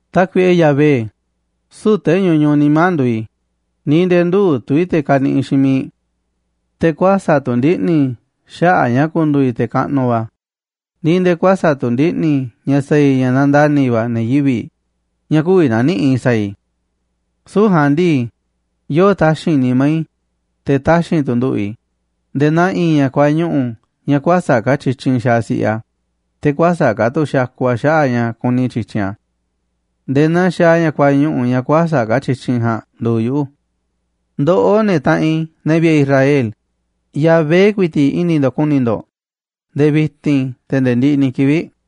Tákuiꞌe Yahvé, süu̱ꞌ te̱ ñuñuꞌ nimá nduuꞌ i̱, ni̱ nde̱e̱ ndüuꞌ tu̱ i̱ te̱ kaniꞌiꞌ xiinꞌ miiꞌ i̱. Te̱ kuäsa̱ꞌ tu̱ ndiꞌni̱ i̱ xaꞌa̱ꞌ ña̱ ku̱ndu̱u̱ i̱ te̱ kaꞌnuꞌ va̱, ni̱ nde̱e̱ kuäsa̱ꞌ tu̱ ndiꞌni̱ i̱ ña̱ sa̱a̱ i̱ ña̱ nandani̱ va̱ ne̱ yivi̱ꞌ ña̱ kü̱vi̱ na̱niꞌi̱ꞌ i̱ sa̱a̱ i̱. Süu̱ꞌ ja̱a̱nꞌ ndii, yoo taxi̱nꞌ nimá i̱, te̱ taxi̱nꞌ tu̱ nduꞌu̱ꞌ i̱ nde̱e̱ naa i̱i̱n ña̱ kuañuꞌu̱ ña̱ kuäsa̱ꞌ ka̱ tyityinꞌ xaaꞌ si̱ꞌiꞌ a̱, te̱ kuäsa̱ꞌ ka̱ tu̱ xakuꞌ a̱ xaꞌa̱ꞌ a̱ ña̱ kuni tyi̱tyinꞌ a̱. Nde̱e̱ naa xaaꞌ ña̱ kuañuꞌu̱ ña̱ kuäsa̱ꞌ ka̱ tyityinꞌ ja̱a̱nꞌ nduuꞌ yuꞌu̱. Ndoꞌó, ne̱ taꞌanꞌ i̱, ne̱ vi̱ꞌe̱ Israel, Yahvé ku̱i̱ti̱ꞌ i̱ni̱ ndo̱ꞌ ku̱ni̱ ndo̱ꞌ, nde̱e̱ vi̱ti̱n, te̱ nde̱e̱ ndiꞌiꞌ ni̱ kivi̱ꞌ.